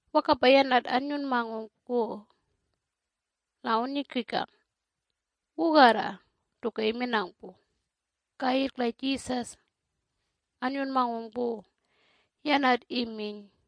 Wakapa yanat annyunmangung pu la awunnyukikang wugarra tuka iminang pu. Kayirrk la Jesus annyunmangung pu, yanat iminy,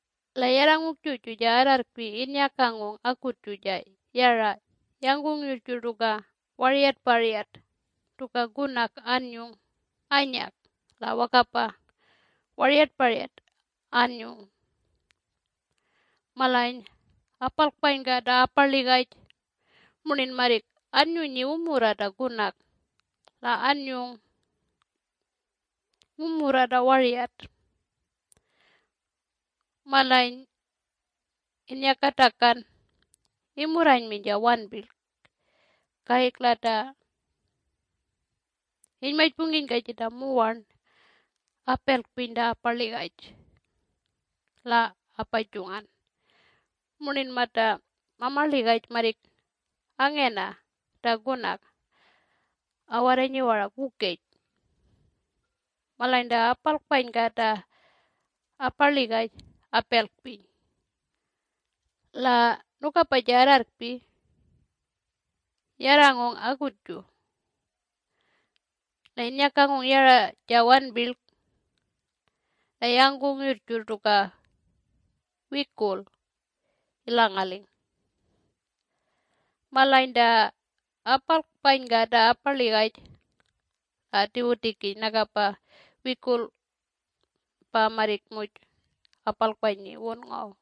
La yarrangung juju ja arrarrkpi innyakangung akutju la yara yangkung yurrjurr tuka waryatparyat tuka kunak anyung anyak la wakapa waryatparyat anyung. Malany apalkpanyka ta aparligaj murnin marrik annyunyi wumurra ta kunak la anyung wumurra ta waryat. Malany inyakatakan imurranyminy ja wanpirlk kayirrk la ta inymajpungkinyka jita muwarn apelkpiny ta aparligaj la apajungan murnin mata mamarligaj marrik angena ta kunak awarranyi warak wukej. Malany ta apalkpanyka ta aparligaj apelkpiny. La nukapa ja arrarrkpi yarrangung akutju la innyakangung yara ja wanpirlk la yangkung yurrjurr tuka wikulk ilangaling. Malany ta apalkpanyka ta aparligaj la atiwutikiny nakapa wikurl pa marrik muj apalkpanyi ta wun ngaw.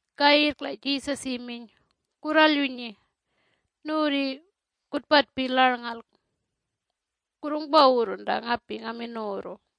Kayirrk la Jesus iminy, “Kurralyunyi nuwurri kutpatpi larlngalk kurrungpawurrun ta ngapi ngamin nuwurru.”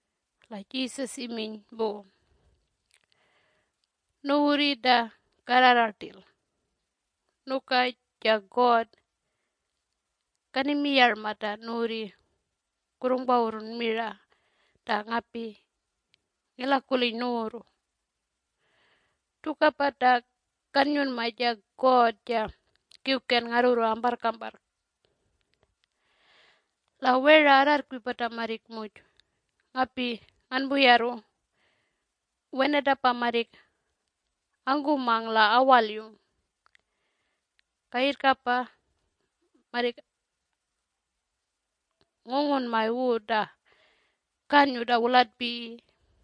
La Jesus iminy pu, “Nuwurri ta karrara rtil, nuka ja God kanimiyarma ta nuwurri kurrungpawurrun mira ta ngapi ngilakuliny nuwurru. Tukapa ta kannyunma ja God ja Kiwken ngarrurru amparrkamparrk. La wera arrarrkpi pata marrik muj ngapi nganpuyarru, wenatapa marrik angkumang la awalyung. Kayirrkapa marrik ngungunmay wu ta kanyu ta wulatpiyi.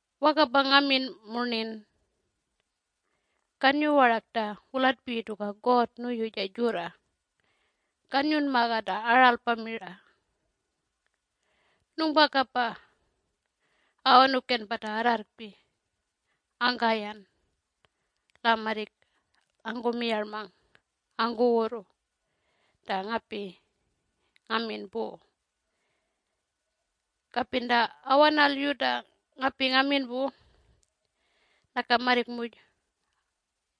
Wakapa ngamin murnin kanyu warak ta wulatpiyi tuka God nuyu ja jurra kanyunmaga ta aralpa mira: Nungpakapa awanuken pata arrarrkpi. Angkayan la marrik angkumiyarmang angkuwurru ta ngapi ngamin pu. Kapin ta awanalyu ta ngapi ngamin pu naka marrik muj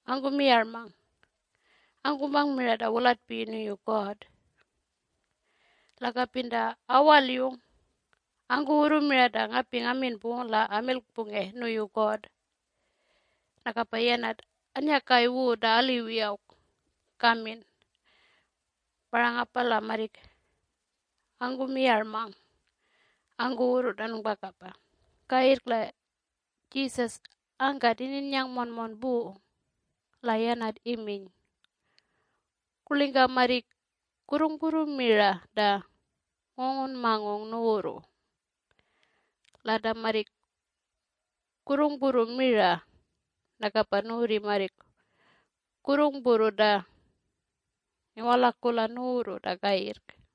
angkumiyarmang angkumang mira ta wulatpiyi nuyu God. La kapin ta awalyung, angkuwurru mira ta ngapi ngamin pu la amilkpunge nuyu God, nakapa yanat annyakay wu ta aliwi awk kamin. Parangapa la marrik angkumiyarmang angkuwurru ta nungpakapa. Kayirrk la Jesus angkat ininnyang monmon pu. La yanat iminy, “Kurlingka marrik kurrungpurru mira ta ngungunmangung nuwurru? La ta marrik kurrungpurru mira nakapa nuwurri marrik kurrungpurru ta ngiwalakula nuwurru ta kayirrk.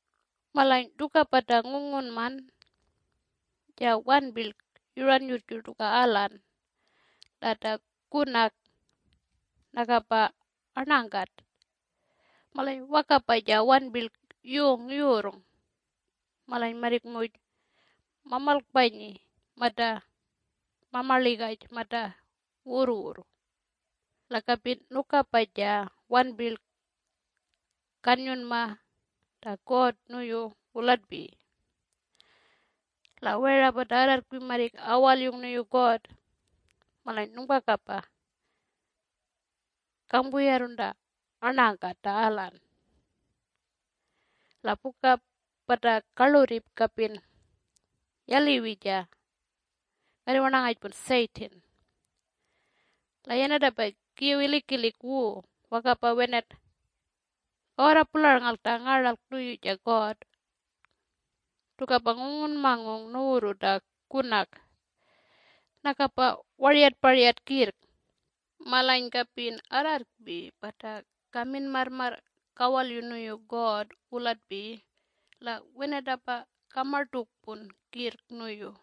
Malany tukapa ta ngungunman, ja wanpirlk yuran yurrjurr tuka alan, la ta kunak nakapa arnangkat, malany wakapa ja wanpirlk yung yurrng. Malany marrik muj mamalkpanyi mata mamarligaj mata wurrwurr. La kapin nukapa ja wanpirlk kannyunmaga ta God nuyu wulatpiyi. La wera pata arrarrkpi marrik awalyung nuyu God. Malany nungpakapa kangpuyarrun ta arnangakat ta alan. La puka pata karlurri kapin yaliwi ja karriwarnangajpun Satan. La yanatapa kiw ngilikilik wu wakapa wenat kawarra pularlngalk ta ngaralk nuyu ja God. Tukapa ngungunmangung nuwurru ta kunak nakapa waryatparyat kirrk. Malany kapin arrarrkpi pata kamin marrmarr kawalyu nuyu God wulatpiyi la wenatapa kamartukpun kirrk nuyu.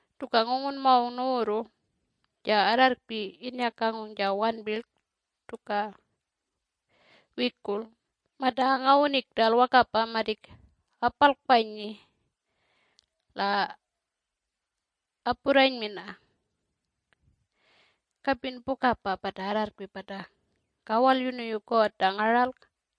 Tuka ngungunmangung nuwurru ja arrarrkpi innyakangung ja wanpirlk tuka wikurl mata angawuning rtal wakapa marrik apalkpanyi la apurranymina. Kapin pukapa pata arrarrkpi pata kawalyu nuyu God ta ngaralk,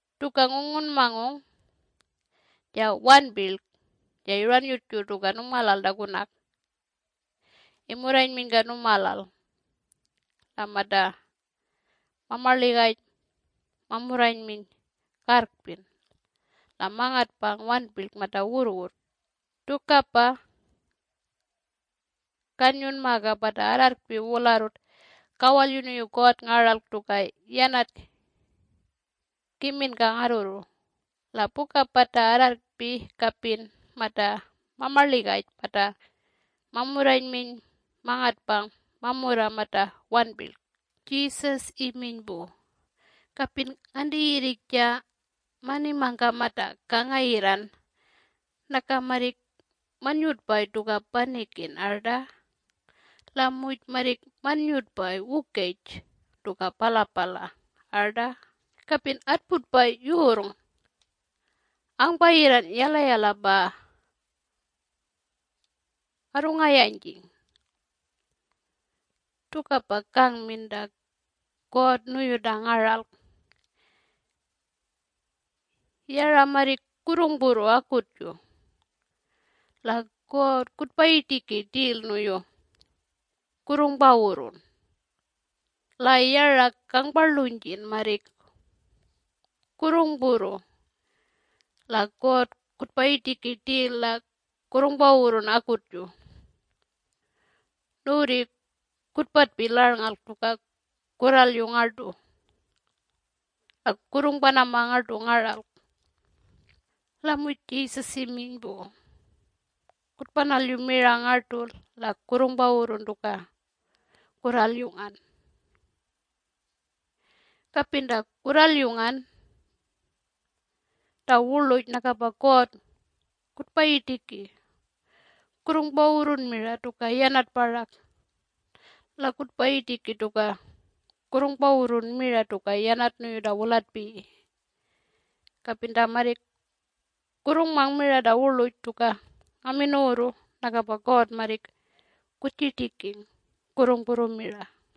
Tuka ngungunmangung, ja wanpirlk ja yuran yurrjurr tuka nungmalal ta kunak imurranyminyka nungmalal, la mata mamaligaj mamurranyminy karrkpin la mangatpang wanpirlk mata wurrwurr. Tukapa kanyunmaga pata arrarrkpi wularrut kawalyu nuyu God ngaralk tuka yanat kiminka ngarrurru. La puka pata arrarrkpi kapin mata mamarligaj mata mamurranyminy mangatpang mamurra mata warnpirlk.” Jesus iminy pu, “Kapin nganti yirrik ja manimangka mata kangayirran naka marrik mannyutpay tuka panikin arta? La muj marrik mannyutpay wukej tuka palapala arta? Kapin atputpay yurrng angpayirran yalayala pa arrungayanjing. Tukapa kangmin ta God nuyu ta ngaralk. Yara marrik kurrungpurru akutju la God kutpayirtiki rtil nuyu kurrungpawurrun. La yara kangparlunjin marrik kurrungpurru la God kutpayitiki rtil la kurrungpawurrun akutju. Nuwurri kutpatpi larnngalk tuka kurralyu ngartu la kurrungpanama ngartu ngaralk.” La muj Jesus iminy pu, “Kutpanalyu mira ngartu la kurrungpawurrun tuka kurralyungan. Kapin ta kurralyungan ta wurluj nakapa God kutpayirtiki kurrungpawurrun mira tuka yanat parak la kutpayirtiki tuka kurrungpawurrun mira tuka yanat nuyu ta wulatpiyi. Kapin ta marrik kurrungmang mira ta wurluj tuka ngamin nuwurru nakapa God marrik kutjirtiking kurrungpurru mira.”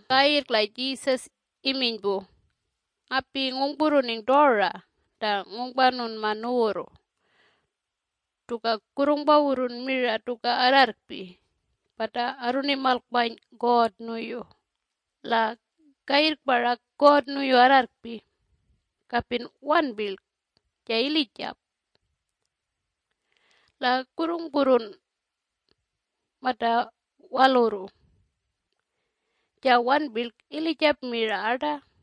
Kayirrk la Jesus iminy pu, “Ngapi ngungpurruning tora ta ngungpanunma nuwurru tuka kurrungpawurrun mira tuka arrarrkpi pata arrunimalkpany God nuyu. La kayirrk parak God nuyu arrarrkpi kapin wanpirlk ja ilijap. La kurrungpurrun mata walurru ja wanpirlk ilijap mira arta?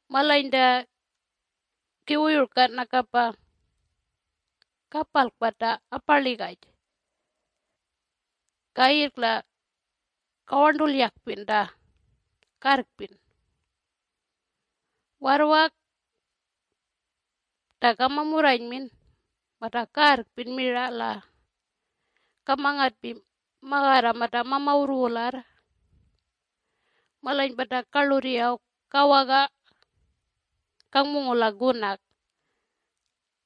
Malany ta kiwuyurka nakapa kapalkpa ta aparligaj kayirrk la kawarntulyakpin ta karrkpin warrwak ta kamamurranymin mata karrkpin mira la kamangatpi magarra mata mamawurr wularr. Malany pata karlurri awk kawaga kangpungula kunak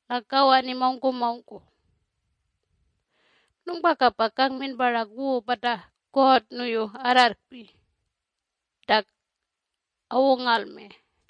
la kawani mawngkumawngku. Nungpakapa kangmin parak wu pata God nuyu arrarrkpi ta awungalme.”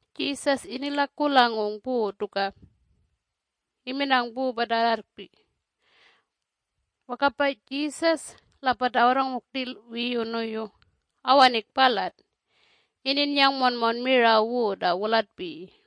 Jesus inilakulangung pu tuka iminang pu pata arrarrkpi. Wakapa Jesus la pata awarrangung rtil wiyu nuyu awaning palat ininnyang monmon mira wu ta wulatpiyi.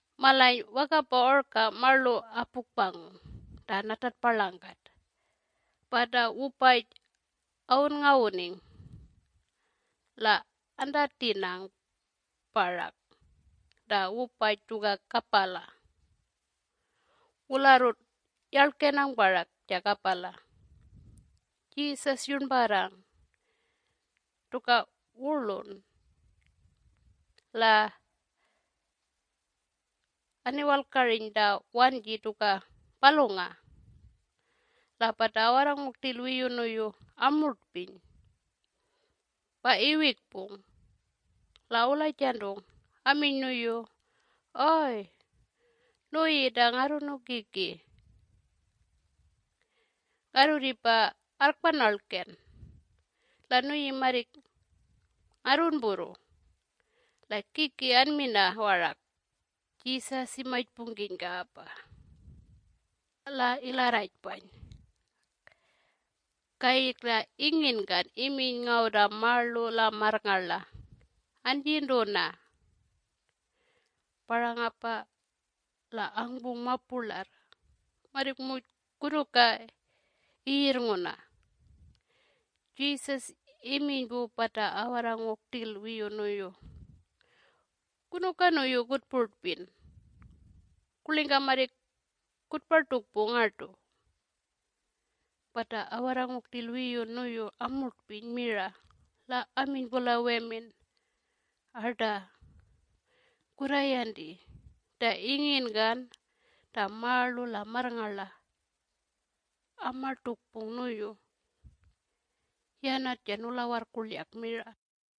Malany wakapa orka marlu apukpangung ta natatparlangkat pa ta wupaj awunngawuning la antatinang parak ta wupaj tuka kapala. Wularrut yarlgenang parak ja kapala. Jesus yurnparrang tuka wurlun la aniwalkariny ta wanji tuka palungang. La pata awarrangung rtil wiyu nuyu amurtpiny pa iwikpung la awulajantung aminy nuyu, “Oy! Nuyi ta Ngarrunukiki, ngarrurripa arrkpanarlkan la nuyi marrik ngarrunpurru! La kiki anmina warak!” Jesus imajpungkinyapa la ilarrajpany kayirrk la inginkan iminy ngaw ta marlu la marrngarla, “Anjintuna!” Parangapa la angpung mapurlarr marrik muj kunuka iyirrnguna. Jesus iminy pu pata awarrangung rtil wiyu nuyu, “Kunuka nuyu kutpurtpin? Kurlingka marrik kutpartukpu ngartu?” Pata awarrangung rtil wiyu nuyu amurtpiny mira la aminy pu la wemin, “Arta kurrayanti! Ta inginkan ta marlu la marrngarla amartukpung nuyu! Yanat ja Nulawarrkurlyak mira!”